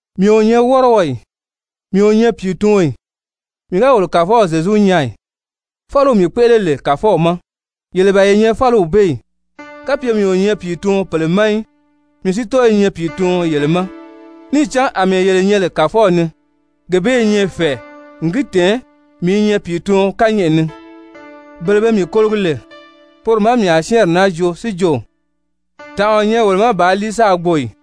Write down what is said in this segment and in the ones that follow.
Mii o nyɛ wɔ́rɔɔ ì? Mii o nyɛ pìituɔn ì? Mii ga wolo Kàfɔw Zyezu nyaa ì? Fáliw mii kpéʔele lè Kàfɔw ma, yele ban ye nyɛ fáliw bee ì? Kapye mii o nyɛ pìituɔn pèle ma í, mii si tɔ́ɔ i nyɛ pìituɔn yele ma. Níì cán àmɛɛ yele nyɛ lè Kàfɔw ni, gee bee i nyɛ fɛ̀ɛ n gi tɛ̀ɛn mii i nyɛ pìituɔn kányɛʔɛ ni. Bele be mii kologi lè, poro má mii a syɛ́ɛnri naa joo si jo: «Tànʔa o nyɛ wolo ma bàā líi sáā gbo ì?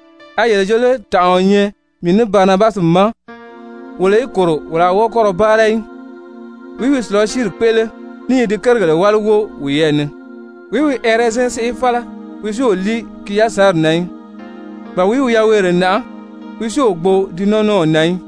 A yele jo lé tànʔa o nyɛ mii ní Barinabasi ma wolo í kòro wolo a wɔ́ɔ kɔ́ ra báara í?» Wìí wi sùlasiiri kpéʔele ní i di kérigèle wáli wóo wiyɛɛ ni? Wìí wi ɛrɛzɛn séʔe fála, wi si o líi ki yasanri na í? Ba wìí wi yaweere nàʔá, wi si o gbo di nɔ́nɔw na í?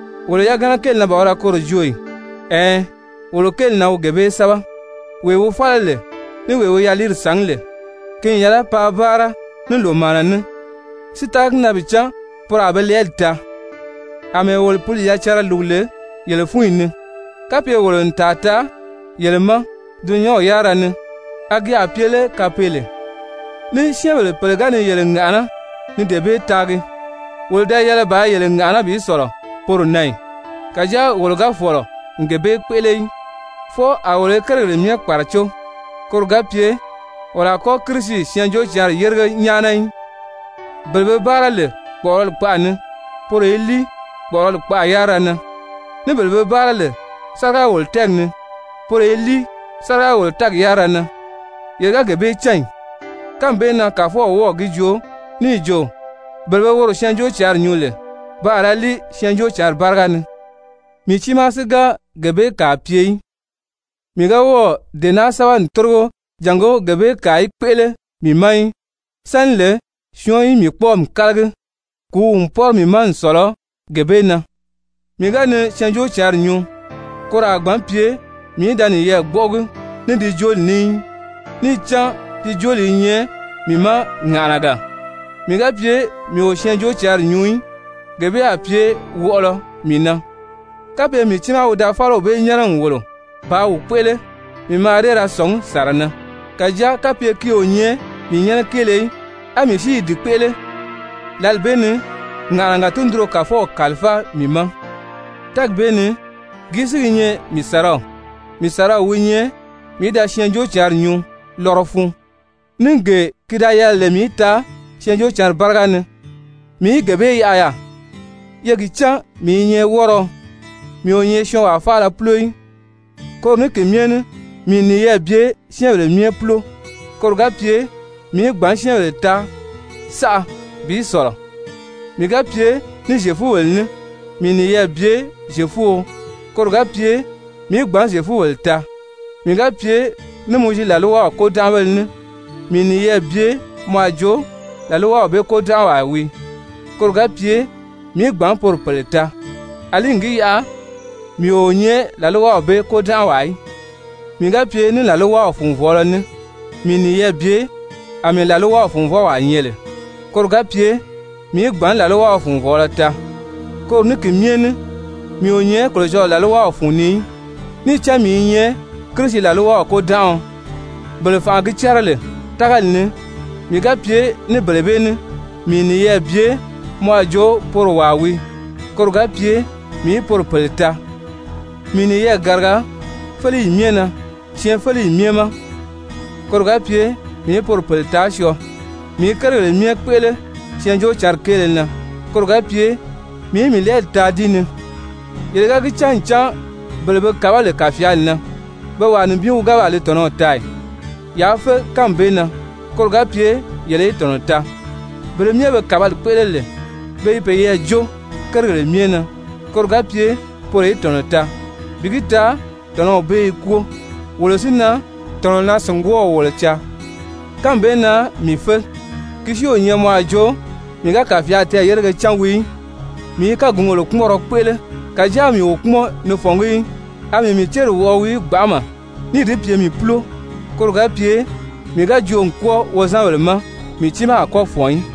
Wolo yagana kéeli na ban wi da koro joo ì? Ɛɛn, wolo kéeli na wi gee bee sɛ́bɛ. Wee wi fála lè, ní wee wi yaliiri sàngí lè, ki n yɛlɛ paa báara ní lòmaana ní si tága gi na bi cán poro a be lɛɛli taa. Amɛɛ wolo Pǐli yacanra lùgu lè yele fúnyi ni, kapye wolo n tàa taa yele ma dulunyanw yárira ni, a gi a pye lé kapeele? Ní syɛ́ɛnbèle pèle ga ni yele ŋàʔaná ni dee bee taagi, wolo da yɛlɛ bàā yele ŋàʔaná bi sɔ̀lɔ poro na ì? Kàjáa wolo ga fɔ̀lɔ n gee bee kpéʔele í, fwɔɔ a wolo i kérigèle myɛ kpàracó, koro ga pye wolo a kɔ́ Kirisi Syɛɛnjóocǎnri yérige nyáana í. Bele be báara lè kpɔ̀ʔɔrɔli kpaʔa ni, poro i líi kpɔ̀ʔɔrɔli kpaʔa yárira na. Ní bele be báara lè sáriga-wòlo-tɛ́ɛgi ni, poro i líi sáriga-wòlo-tɛ́ɛgi yárira na, yele ga gee bee cán ì? Kánmi bee na Kàfɔw wɔ́ɔ̀ gi joo níì jo, bele be woro Syɛɛnjóocǎnri nyuu lè, pe a ra líi Syɛɛnjóocǎnri báriga ni. Mii tiimaa si ga gee bee kàa pye í, mii ga wɔ́ɔ̀ dee naa sɛ́bɛ n tórigo jàngó gee bee kàa í kpéʔele mii ma í. Sáni lè syɔɔn í mii kpɔ́ɔmi kálagi, kùúw n pɔ́rɔ mii ma n sɔ̀lɔ gee bee na! Mii ga ni Syɛɛnjóocǎnri nyuu, koro a gbǎn pye mii í da niyɛɛ gbɔ́ʔɔgi ní di jooli ní í, níì cán di jooli i nyɛ mii ma ŋàʔanaga. Mii ga pye mii o Syɛɛnjóocǎnri nyuu í, gee bee a pye wɔʔɔlɔ mii na! Kapye mii tiimaa wi da fáliw bee nyɛ́nɛ n wòlo bàā wi kpéʔele, mii mǎà dée ra sɔ̀ngí sàra na. Kàjáa kapye ki o nyɛ mii nyɛ́nɛ kéele í á mii si i di kpéʔele, lǎli bee ni ŋàʔanaga tundunro Kàfɔw kàlifáa mii ma. Tɛ́ɛgi bee ni gìí si gi nyɛ mii sàraw? Mii sàraw wi nyɛ mii í da Syɛɛnjóocǎnri nyuu lɔrɔ fun. Ní gee ki da yɛlɛ lè mii í taa Syɛɛnjóocǎnri báriga ni, mii í gee bee yaʔa yaà. Ye gi cán mii i nyɛ wɔ́rɔɔ, mii o nyɛ syɔɔnwaa faala púlo í. Koro ní ki myɛ ní mii n niyɛɛ bye syɛ́ɛnbèle myɛ púlo, koro ga pye mii í gbǎn syɛ́ɛnbèle taa saʔa bi sɔ̀lɔ. Mii ga pye ní Zyefubèle ní, mii n niyɛɛ bye Zyefuo koro ga pye mii í gbǎn Zyefubèle taa. Mii ga pye ní Mowizi làlwaw kôdanʔabéle ní, mii n niyɛɛ bye mɔ a jo làlwaw bee kôdanʔawaa wii, koro ga pye mii í gbǎn poro pèle taa, àlí n gi yaʔa mii o nyɛ làlwaw bee kôdanʔawaa í. Mii ga pye ní làlwaw funvɔɔlɔ ní, mii n niyɛɛ bye àmɛɛ làlwaw funvɔwaa nyɛ lè, koro ga pye mii í gbǎn làlwaw funvɔɔlɔ taa, koro ní ki myɛ ní mii o nyɛ Kolocɔlɔɔ làlwaw fun ni í, níì cán mii i nyɛ Kirisi làlwaw kôdanʔaɔ. Bele fànʔa gi cɛ́rɛ lè tágali ni, mii ga pye ní bele bee ní, mii n niyɛɛ bye mɔ a jo poro wàa wii, koro ga pye mii í poro pèle taa. Mii n niyɛɛ gàriga féleyi myɛ na syɛɛnfeleyi myɛ ma, koro ga pye mii í poro pèle taa syɔɔ. Mii i kérigèle myɛ kpéʔele Syɛɛnjóocǎnri kéele na, koro ga pye mii í mii lɛɛli taa di ni. Yele ga gi cán ncan bele be kàbá lè kàfyaali na, pe wàa nibin wi gáa baa li tɔ̀nɔw taa ì? Yaa fé kánmi bee na, koro ga pye yele í tɔ̀nɔ taa. Bele myɛ be kàbali kpéʔele lè, pe i peyɛɛ jó kérigèle myɛ na, koro ga pye poro í tɔ̀nɔ taa, bi gi taa tɔ̀nɔw bee i kwóo. Wolo si na, tɔ̀nɔnaa-sìngwɔɔw wolo caa. Kánmi bee na mii fé, ki si o nyɛ mɔ a jo mii ga kàfyaali tɛɛ̀yérege cán wii í. Mii i kágungèle kpúmɔnrɔ kpéʔele, kàjáa mii o kpúmɔn ni fɔ̀ngí í. A mii mii céri wɔʔɔ wii gbanʔama níì di pye mii púlo, koro ga pye mii ga joo n kwɔ́ɔ wozanbèle ma, mii tiimaa a kɔ́ fɔ̀n í.